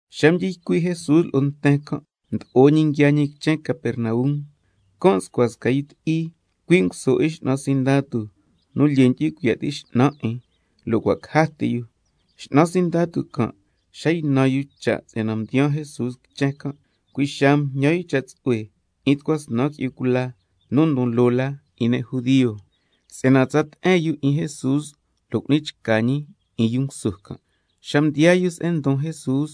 Xa mdyi ycui' Jesús lo'o nten can', mdo'o ñi nguiaa ñi quichen Capernaum. Can' nscua sca yu ti'i, cui' nguso 'in x'nan sindatu nu lyee ndyu'hui cuiya' ti' x'nan 'in, lo' cua' caja ti yu. X'nan sindatu can' xa ynan yu cha' si'yana mdiyaa Jesús quichen can', cui' xaa mjñan yu cha' tsu'hue 'in tucua snan qui'yu cula nu ndon loo la 'in ne' judio, si'yana tsa te'en yu 'in Jesús lo' cu'ni chca ñi 'in yu nguso can'. Xa mdiyaa yu se'en ndon Jesús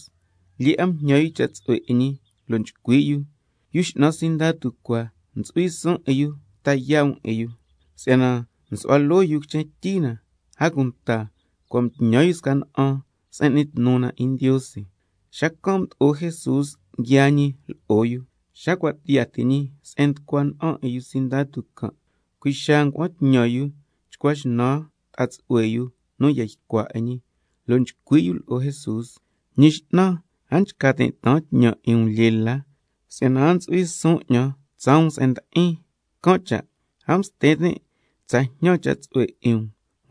lyee 'a mjñan yu cha' tsu'hue 'in ñi, lo' nchcui' yu: Yu x'nan sindatu cua, ntsu'hui suun 'in yu ta yaa' um 'in yu, si'yana nsu'hua loo yu quichen tyi na, a cunta cua' mtñan yu sca na'an se'en n'ni tnu na 'in Ndiose. Xacan' mdo'o Jesús nguiaa ñi lo'o yu. Xa cua' tiyaa ti ñi se'en nducua na'an 'in yu x'nan sindatu can', cui' xaa ngua'an tñan yu chcua xnan ta'a tsu'hue yu nu ya ycua 'in ñi lo' chcui' yu lo'o Jesús: Ñi X'nan, a nchca tin' taan tñan 'in um lyee la, si'yana a ntsu'hui suun 'ñan tsaa um se'en ndi'in, can' cha' a msti tin' tsa jñan cha' tsu'hue 'in um,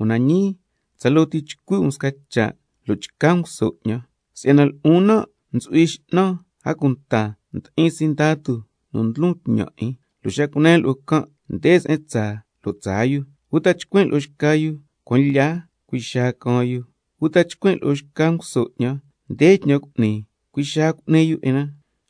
una ñii tsaloo ti chcui' um sca cha' lo' chca nguso 'ñan. Si'yana lo'on nan' ntsu'hui x'nan, a cunta ndi'in sindatu nu ndlon tñan 'in, lo' xa cunen lo'o can': Nde se'en tsaa, lo' tsaa yu, uta chcuin' lo'o xca yu: Cuan lya, cui' xaa caan yu, uta chcuin' lo'o sca nguso 'ñan: Nde tñan cu'ni, cui' xaa cu'ni yu 'in na.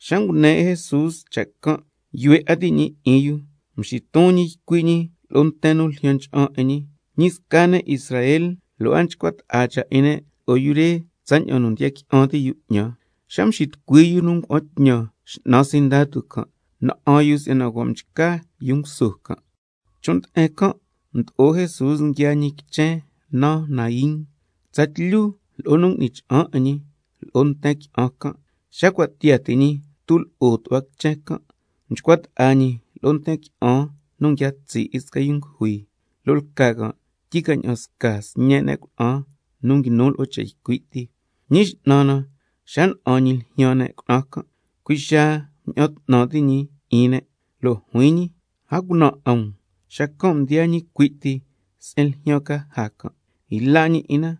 Xa ngune 'in Jesús cha' can', yuhue 'a ti' ñi 'in yu, mxiton ñi ycui' ñi lo'o nten nu ljyan ncha'an 'in ñi: Ñi sca ne' Israel lo' a nchcua ta'a cha' 'in ne' lo'o yu re tsaña'an nu ndiya qui'an ti' yu 'ñan. Xa mxitucui yu nu ngua'an tñan x'nan sindatu can', na'an yu si'yana cua' mchca yu nguso can'. Chon' nde'en can' mdo'o Jesús nguiaa ñi sca quichen naan Naín, tsatlyu lo'o nu ngui'ni cha'an 'in ñi lo'o nten qui'an can'. Xa cua' tiyaa ti ñi tulo'o tu'hua quichen can', mchcua ta'a ñi lo'o nten qui'an nu nguia tsi' 'in sca nu ngujui, lo' lca can' tyi ca ña'an sca sñe' ne' cuna'an nu nguinu lo'o cha' ycui' ti. Ñi X'nan na xa na'an ñi ljyaan ne' cuna'an can', cui' xaa mña'an 'tnan ti' ñi 'in ne', lo' juin ñi lo'o: A cunan 'a um. Xacan' mdiyaa ñi cui' ti se'en ljyaan caja can', yla' ñi 'in na,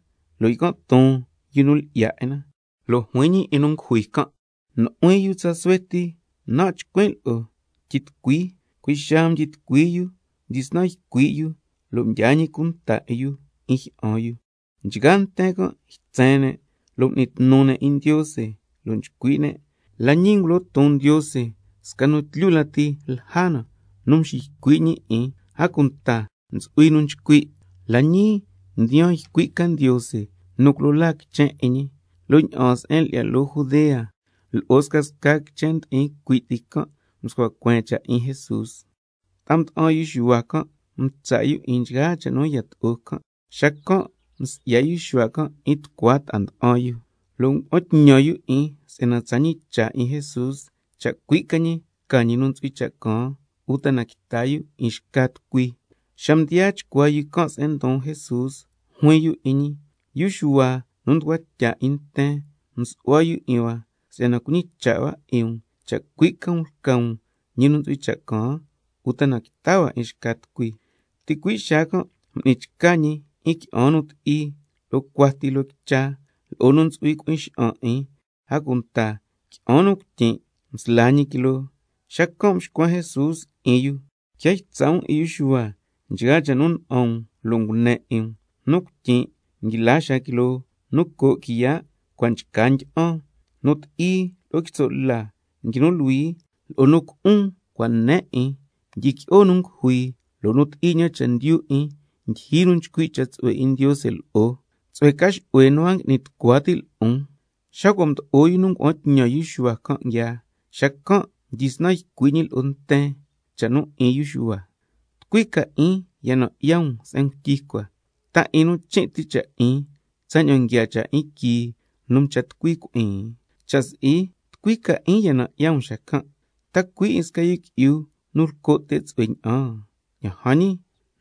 lo' ycan' ton yu nu lyi'ya 'in na, lo' juin ñi 'in nu ngujui can': Nu'huin yu tsa suhue ti nan' nchcuin' lo'o, Tyitucui. Cui' xaa mdyitucua yu, mdyisnan ycui' yu, lo' mdyaa ñi cunta 'in yu 'in jyi'an yu. Nchgaa nten can' ytsen ne' lo' m'ni tnu ne' 'in Ndiose, lo' nchcui' ne': La ñii ngulo ton Ndiose sca nu tlyu lati lja na nu nxiycui' ñi 'in. A cunta ntsu'hui nu nchcui': La ñii mdiyaan ycui' ca Ndiose nu culo laa quichen 'in ñi. Lo' ña'aan se'en lyi'ya loo Judea lo'o scasca quichen ndi'in cui' ti can' mscua cueen cha' 'in Jesús. Ta'a nda'an yu Xuhua can' mtsa' 'in yu nchgaa cha' nu yato'o can'. Xacan' msi'ya yu Xuhua can' 'in tucua ta'a nda'an yu, lo' ngua'an tñan yu 'in si'yana tsa ñicha' 'in Jesús cha' cui' ca ñi lca ñi nu ntsu'hui cha' caan, uta quita yu 'in xca tucui. Xa mdiyaa chcuaa yu can' se'en ndon Jesús, juin yu 'in ñi: Yu Xuhua nu mducua tya 'in nten msu'hua yu 'in hua si'yana cuñicha' hua 'in um cha' cui' um lca um ñi nu ntsu'hui cha' caan, uta quita hua 'in xca tucui? Ticui' xaa can' m'ni chca ñi 'in qui'an nu ti'i lo'o cuati loo quicha, lo'o nu ntsu'hui cui'in xa'an 'in, a cunta qui'an nu cuityin' msla ñi quiloo. Xacan' mxcuen Jesús 'in yu: Quia ytsa' um 'in yu Xuhua nchgaa cha' nu na'an um lo' ngune 'in um: —Nu cuityin' nguila xaa quiloo, nu co' quiya' cua' nchca ndyi'an—, nu ti'i lo'o quitso' la nguinu luhui, —lo'o nu cu'un cua' ne 'in—, ndyiqui'o nu ngujui, —lo' nu ti'i ña'an chendyu 'in ndyijyi nu nchcui' cha' tsu'hue 'in Ndiose lo'o—, tsu'hue ca xu'hue nu a ngui'ni tucua ti' lo'on. Xa cua' mdo'o yu nu ngua'an tñan yu Xuhua can' nguiaa, xacan' mdyisnan ycui' ñi lo'o nten cha' 'in yu Xuhua: ¿Tucui ca 'in ya nan' 'ya um se'en ngutyi cua? ¿Ta 'in nu chin' cha' 'in tsaña'an nguiaa cha' 'in quii nu mcha ti'in cui'in? Cha' si'i, ¿tucui ca 'in ya nan' 'ya um xacan'? ¿Ta cui' 'in sca yu qui'yu nu lco' te' tsu'hue ña'an? Ña'an jan ñi,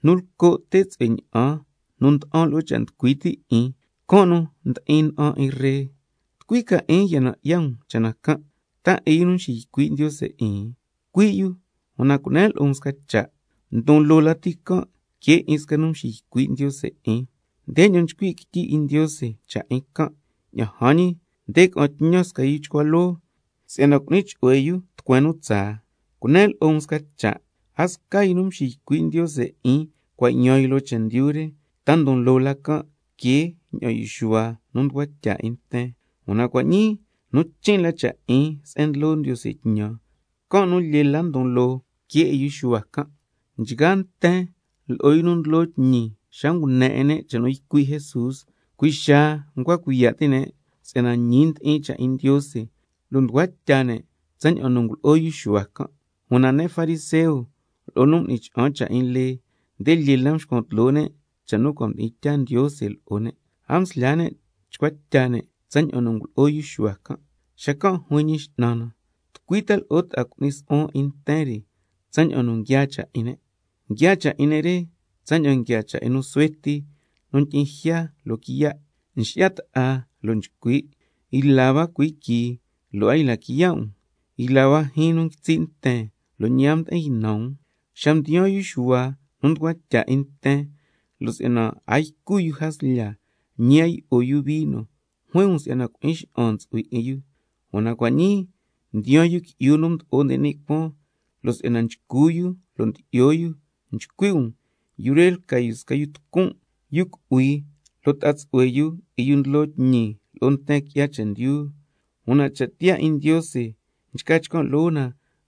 nu lco' te' tsu'hue ña'an nu nda'an lo'o cha' nducui ti' 'in, can' nu ndi'in na'an 'in ree. ¿Tucui ca 'in ya na'an um cha' na can'? ¿Ta 'in yu nu nxiycui' Ndiose 'in? Cui' yu, una cunen lo'o um sca cha': Ndon loo lati can' que 'in sca nu nxiycui' Ndiose 'in. Ndeña'an nchcui' quityi 'in Ndiose cha' 'in can': —Ña'an jan ñi, ca'an tñan 'in sca nu chcua loo, can' nu cu'ni chu'hue tucueen tsaa—. Cunen lo'o um sca cha', a sca yu nu mxiycui' Ndiose 'in nu cua' yaan loo chendyu re, ta ndon loo la que ña'an yu Xuhua nu mducua tya 'in nten. Una cua' ñii nu chin' la cha' 'in se'en ndlo Ndiose tñan, can' nu lyee la ndon loo que 'in yu Xuhua can'. Nchgaa nten lo'o yu nu ndlo tñi xa ngune 'in ne' cha' nu ycui' Jesús, cui' xaa ncua cuiya' ti' ne' si'yana ñi ndi'in cha' 'in Ndiose, lo' mducua tya ne' tsaña'an nu ngulo'o yu Xuhua can'. Una ne' fariseo lo'o nu m'ni cha'an cha' 'in lee, nde mxcuan tloo ne' cha' nu cua' mdi'in tyaa Ndiose lo'o ne', a mslyaa ne' chcua tya ne' tsaña'an ngulo'o yu Xuhua can'. Xacan' juin Ñi X'nan na: ¿Tucui ta lo'o tca cu'nin su'huan 'in ta nten re tsaña'an nu nguiaa cha' 'in ne'? Nguiaa cha' 'in ne' re tsaña'an cha' 'in nu suhue ti nu ndyi'in jya loquiya', nxi'ya ta'a lo' nchcui': Yla hua cuhuii quii lo' a yla quiya' um, yla hua jyiin nu nguitsi' nten, lo' ñi a mdi'in ynan um. Xa mdiyaan yu Xuhua nu mducua tya 'in nten, lo' si'yana a ycu yu jaslya ñi a yi'o yu vino, juin um si'yana cui'in xa'an ntsu'hui 'in yu. Una cua' ñii mdiyaan Yu Qui'yu nu Mdo'o nde ni' Cuaan, lo' si'yana nchcu yu lo' ndyi'yo yu, nchcui' um: Yu re lca yu sca yu tucun', yu cu'hui, lo' ta'a tsu'hue yu 'in yu ndlo tñi lo'o nten qui'ya chendyu. Una cha' tiyaa 'in Ndiose nchca chcan' loo na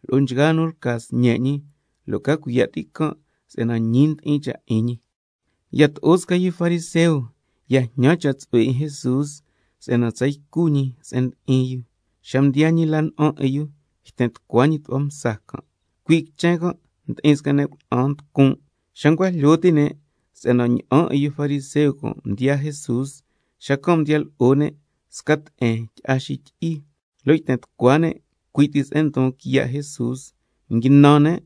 lo'o nchgaa nu lca sñe' ñi, lo' ca cuiya' ti' can' si'yana ñi ndi'in cha' 'in ñi. Yato'o sca yu fariseo ya jñan cha' tsu'hue 'in Jesús si'yana tsa ycu ñi se'en ndi'in yu. Xa mdiyaa ñi la na'an 'in yu yten tucua ñi tu'hua msa can'. Cui' quichen can' ndi'in sca ne' cuna'an nducun', xa ncua jlyo ti' ne' si'yana ña'an 'in yu fariseo can' mdiyaa Jesús, xacan' mdiya lo'o ne' sca te'en tyi'a xityi'i, lo' yten tucua ne' cui' ti se'en ndon quiya' Jesús, nguinan ne'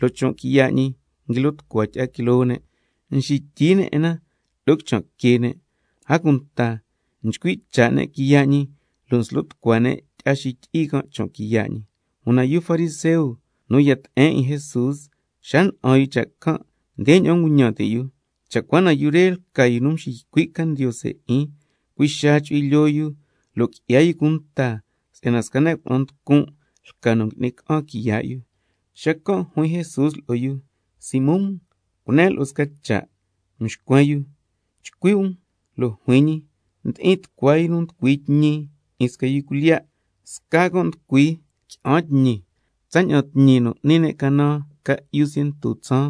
lo' chon' quiya' ñi nguilo tucua tyi'a quiloo ne', nxityi ne' 'in na lo'o quichan' que ne', a cunta nchcui' cha' ne' quiya' ñi lo' nslo tucua ne' tyi'a xityi'i can' chon' quiya' ñi. Una yu fariseo nu ya te'en 'in Jesús xa na'an yu cha' can', ndeña'an nguñan ti' yu: Cha' cua na yu re lca yu nu nxiycui' ca Ndiose 'in, cui' xaa chu'hui lyoo yu lo' qui'ya yu cunta si'yana sca ne' cuna'an nducun' lca nu ngui'ni ca'an quiya' yu. Xacan' juin Jesús lo'o yu: Simón, cunen lo'o um sca cha'. Xacan' mxcuen yu: Chcui' um. Lo' juin ñi: Ndi'in tucua yu nu nducui tñi 'in sca yu cuilyiya', sca can' nducui qui'an tñi, tsaña'an tñi nu n'ni ne' canan ca'yu ciento tsaan,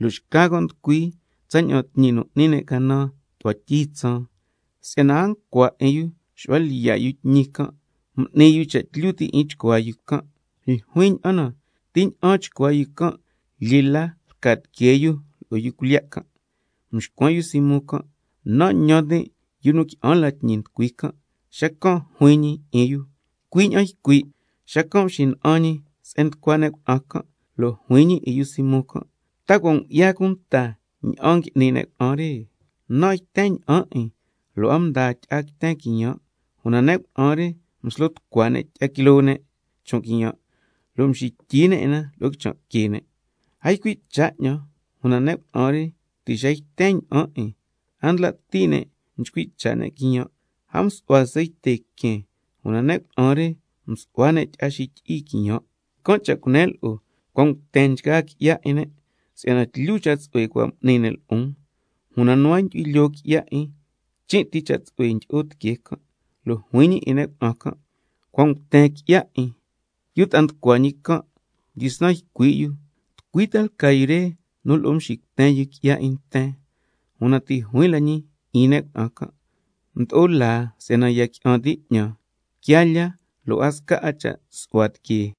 lo' xca can' nducui tsaña'an tñi nu n'ni ne' canan tu'hua tyi tsaan. Si'yana a ncua 'a 'in yu xu'hua lyiya' yu tñi can', m'ni yu cha' tlyu ti' 'in chcuaa yu can'. Ljuin ña'an na, ¿ti ña'an chcuaa yu can' lyee la lca tiquee yu lo'o yu cuilyiya' can'? Mxcuen yu Simón can': Ñan tin' yu nu qui'an la tñi mducui can'. Xacan' juin ñi 'in yu: Cui' ña'an ycui'. Xacan' mxina'an ñi se'en nducua ne' cuna'an can' lo' juin ñi 'in yu Simón: ¿Ta cua' ngu'ya cunta ña'an ngui'ni ne' cuna'an re? Nan' yten ña'an 'in lo' a mdaa tyi'a quiten quiyan', una ne' cuna'an re mslo tucua ne' tyi'a quiloo ne' chon' quiyan' lo' mxityi ne' 'in na lo'o quichan' que ne'. A ycui' cha' 'ñan, una ne' cuna'an re ti' xa yten ña'an 'in, a ndla' ti' ne' nchcui' cha' ne' quiyan'. A msu'hua ceite quen, una ne' cuna'an re msu'hua ne' tyi'a xityi'i quiyan'. Can' cha' cunen lo'o, cua' nguten nchgaa qui'ya 'in ne' si'yana tlyu cha' tsu'hue cua' m'ni ne' lo'on, una nu a ndyu'hui lyoo qui'ya 'in chin' ti cha' tsu'hue ndyi'o tiquee can'. Lo' juin ñi 'in ne' cuna'an can': Cua' nguten qui'ya 'in. Yu ta'a nducua ñi can' mdyisnan ycui' yu: ¿Tucui ta lca yu re nu lo'o nxicuten yu qui'ya 'in nten? Una ti' juin la ñi 'in ne' cuna'an can': Mdo'o laa si'yana ya qui'an ti' 'ñan, quiaa lyaa lo' a sca la cha' su'hua tiquee.